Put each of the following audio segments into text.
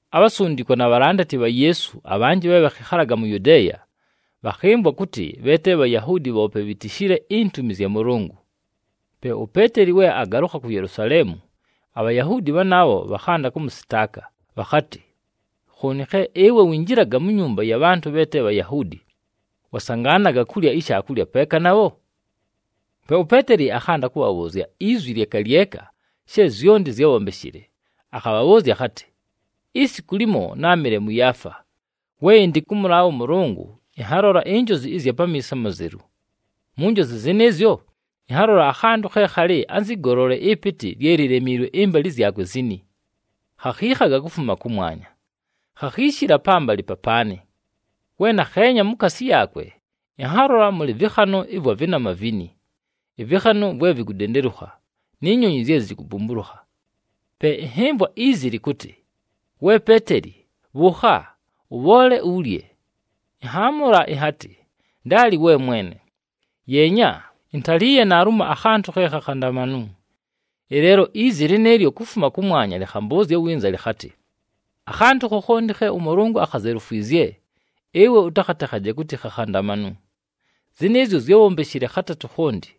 Abhasundikwa na bhalandati bha Yeesu abhanjɨ bhe bhakhɨkhalaga mu Yudeeya, bhakhɨmvwa kʉtɨ bhe te Bhayahuudi bhoope bhitishile intumi zya Mʉlʉngʉ. Pe uPeeteli we agalʉkha ku Yelusaleemu, aBhayahuudi bhanaabho bhakhanda kʉmʉsɨtaaka bhakhatɨ, “Khooni ɨwe khe winjilaga mu nyumba ya bhantʉ bhe te Bhayahuudi, wasangaanaga kulya ishaakulya peeka nabho?” Pe uPeeteli akhanda kʉbhabhʉʉzya izwi lyeka lyeka she zyonti zyábhombeshile, akhabhabhʉʉzya akhatɨ, “Isiku limo, náamɨle mʉ Yaafa. We ɨndɨ kʉmʉlaabha ʉMʉlʉngʉ, ɨnhalola injozi ɨzya pamiiso amazelu. Mu njozi zɨnɨɨzyo, ɨnhalola akhantʉ khe khalɨ anzɨ golole ɨpɨtɨ lye lilemiilwe ɨmbalɨ zyakwe zini. Khakhiikhaga kufuma kʉmwanya, khakhiishila pambalɨ papaanɨ. We nakheenya mukaasi yaakwe, ɨnhalola mʉlɨ vɨkhanʉ ɨvwa vɨnama vini, ɨvɨkhanʉ vwe vikudendelukha, ni nyonyi zye zikubumbulukha. “Pe ɨnhɨmvwa izi, lɨkʉtɨ, ‘We Peeteli, bhʉʉkha! Ʉbhoole ulye!’ Ɨnhaamʉla ɨnhatɨ, ‘Ndaali, we Mwene! Yeenya, intaliiye naalumo akhantʉ khe khakhandamanu!’ Ɨleelo izi lɨnɨɨlyo kufuma kʉmwanya lɨkhambʉʉzya winza lɨkhatɨ, ‘Akhantʉ khokhonti khe ʉMʉlʉngʉ akhazelufwizye, ɨwe ʉtakhatekhaje kʉtɨ khakhandamanu.’ Zɨnɨɨzyo zyábhombeshile khatatʉ khonti,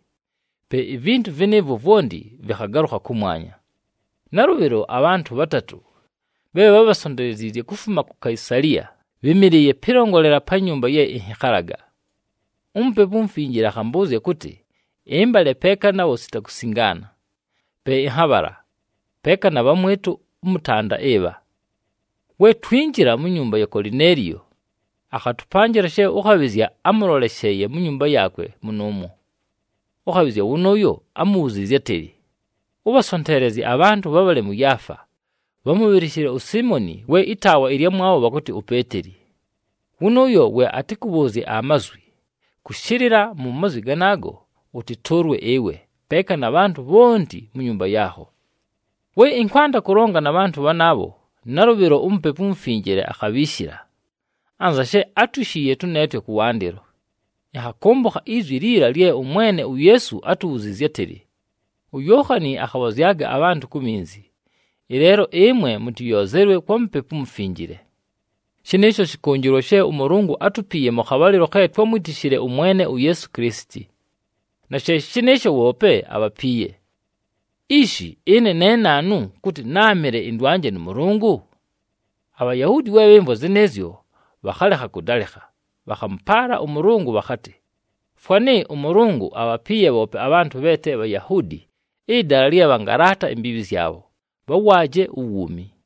pe ivintu vɨnɨɨvwo vwonti vɨkhagalʉkha kʉmwanya. “Nalʉbhɨlo abhantʉ bhatatʉ bhe bhábhasonteleziizye kufuma ku Kaisaliya bhɨ́mɨlɨɨye pɨlongolela pa nyumba ye ɨnhɨkhalaga. UMupepu uMufinjile akhambʉʉzya kʉtɨ ɨmbale peeka nabho sita kusingaana. Pe ɨnhabhala, peeka na bhamwɨtʉ ʉmʉtanda ɨbha. We twinjila mu nyumba ya Kolineeliyo, akhatʉpanjɨla she ʉkhabhɨzya ámʉlolesheeye mu nyumba yaakwe mʉnʉʉmwo. Ʉkhabhɨzya wʉnʉʉyo ámubhuziizye átɨlɨ, ‘Ʉbhasonteelezye abhantʉ bhabhale mʉ Yaafa, bhamʉbhɨlɨshɨle uSiimoni we ɨtaawa ɨlyamwabho bhakʉtɨ uPeeteli. Wʉnʉʉyo we atɨkʉbhʉʉzye amazwi, kʉshɨlɨla mu mazwi ganaago ʉtɨtʉʉlwe ɨwe, peeka na bhantʉ bhonti mu nyumba yaakho.’ “We ɨnkwanda kʉlonga na bhantʉ bhanaabho, nalʉbhɨlo uMupepu uMufinjile akhabhiishila, anza she átwishiiye tʉneetwe kʉwandɨlo. Ɨnhakʉmbʉkha izwi liila lye ʉMwene uYeesu átubhuziizye átɨlɨ, ‘UYookhani akhabhozyaga abhantʉ ku minzi, ɨleelo ɨmwe mʉtɨyoozelwe kwa Mupepu uMufinjile.’ Shɨnɨɨsho shɨkʉnjɨlwa she ʉMʉlʉngʉ átupiiye mʉ khabhalɨlo khe twámwitishile ʉMwene uYeesu Kilisiti, na she shɨ shɨnɨɨsho bhoope abhapiiye. Ishi! Ɨne ne naanu kʉtɨ náamɨle ɨndwanje nʉ Mʉlʉngʉ?” “ABhayahuudi we bhɨmvwa zɨnɨɨzyo, bhakhalekha kʉdalɨkha. Bhakhamʉpaala ʉMʉlʉngʉ bhakhatɨ, ‘Fwanɨ ʉMʉlʉngʉ abhapiiye bhoope abhantʉ bhe te Bhayahuudi ɨdala lye bhangalaata imbiibhi zyabho, bhawaaje uwuumi!’”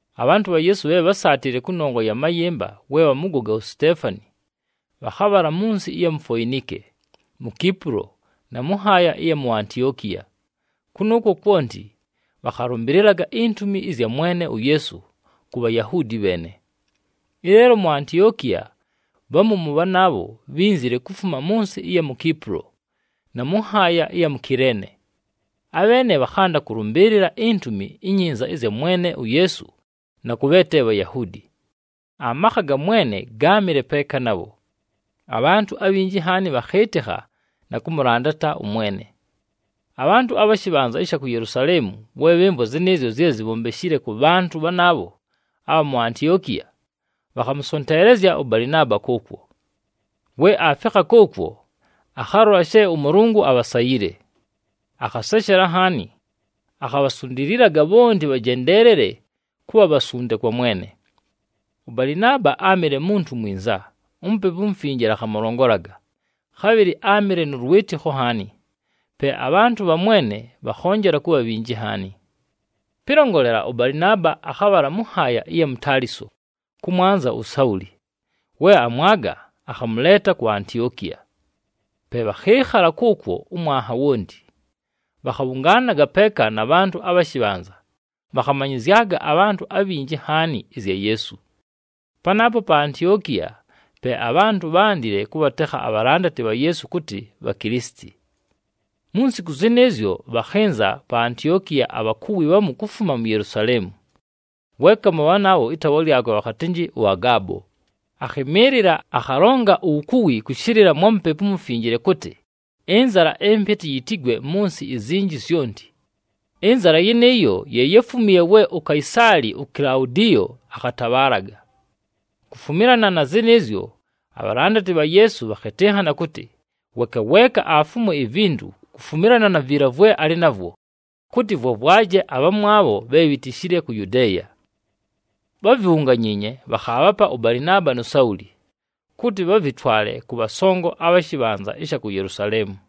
Abhantʉ bha Yeesu bhe bhásaatile kʉnongwa ya mayɨmba we bhamʉgoga uSiteefani, bhakhabhala mʉ nsɨ ɨya mu Foinike, mu Kipulo, na mʉ nhaaya ɨya mu Antiokiya. Kʉnʉʉkwo kwonti, bhakhalʉmbɨlɨlaga intumi ɨzya Mwene uYeesu ku Bhayahuudi bheene. Ɨleelo mu Antiokiya, bhamu mʉ bhanaabho, bhínzile kufuma mʉ nsɨ ɨya mu Kipulo, na mʉ nhaaya ɨya mu Kileene. Abheene bhakhanda kʉlʉmbɨɨlɨla iNtumi iNyinza ɨzya Mwene uYeesu na kʉ bhe te Bhayahuudi. Amakha ga Mwene gáamɨle peeka nabho, abhantʉ abhinji nhaani bhakhɨɨtɨkha na kʉmʉlandata ʉMwene. Abhantʉ abha shɨbhanza ɨsha ku Yelusaleemu, we bhɨmvwa zɨnɨɨzyo zye zibhombeshile kʉ bhantʉ bhanaabho abha mu Antiokiya, bhakhamʉsonteelezya ʉBalɨnaaba kʉʉkwo. We aafikha kʉʉkwo, akhalola she ʉMʉlʉngʉ abhasayile. Akhaseshela nhaani, akhabhasundililaga bhonti bhajendeelele kʉbha bhasunde kwa Mwene. ɄBalɨnaaba áamɨle muntu mwinza, uMupepu uMufinjile akhamʉlongolaga, khabhɨlɨ áamɨle nʉ lwɨtɨkho nhaani. Pe abhantʉ bha Mwene bhakhonjela kʉbha bhinji nhaani. Pɨlongolela, ʉBalɨnaaba akhabhala mʉ nhaaya ɨya mu Taliso kʉmwanza uSauli. We amwaga, akhamʉleeta ku Antiokiya. Pe bhakhɨɨkhala kʉʉkwo ʉmwanha wonti, bhakhabhʉngaanaga peeka na bhantʉ abha shɨbhanza, bhakhamanyɨzyaga abhantʉ abhinji nhaani ɨzya Yeesu. Panaapo pa Antiokiya pe abhantʉ bhándile kʉbhatekha abhalandati bha Yeesu kʉtɨ Bhakilisiti. Mu nsiku zɨnɨɨzyo, bhakhɨnza pa Antiokiya abhakuwi bhamu kufuma mu Yelusaleemu. Weeka mʉ bhanaabho, ɨtaawa lyakwe bhakhatɨnjɨ ʉAgaabo, akhɨmɨɨlɨla, akhalonga uwukuwi kʉshɨlɨla mwa Mupepu uMufinjile kʉtɨ, ɨnzala ɨmpɨtɨ yitigwe mʉ nsɨ izinji zyonti. Ɨnzala yɨnɨɨyo ye yáfumiiye we uKaisaali uKilaudiyo akhatabhaalaga. Kufumilana na zɨnɨɨzyo abhalandati bha Yeesu bhakhɨtɨnhana kʉtɨ, weeka weeka afumwe ivintu, kufumilana na viila vwe alɨ navwo, kʉtɨ vwavwaje abhamwabho bhe bhitishile ku Yudeeya. Bhávibhunganyiinye, bhakhaabhapa ʉBalɨnaaba nu Sauli, kʉtɨ bhavɨtwale kʉ bhasongo abha shɨbhanza ɨsha ku Yelusaleemu.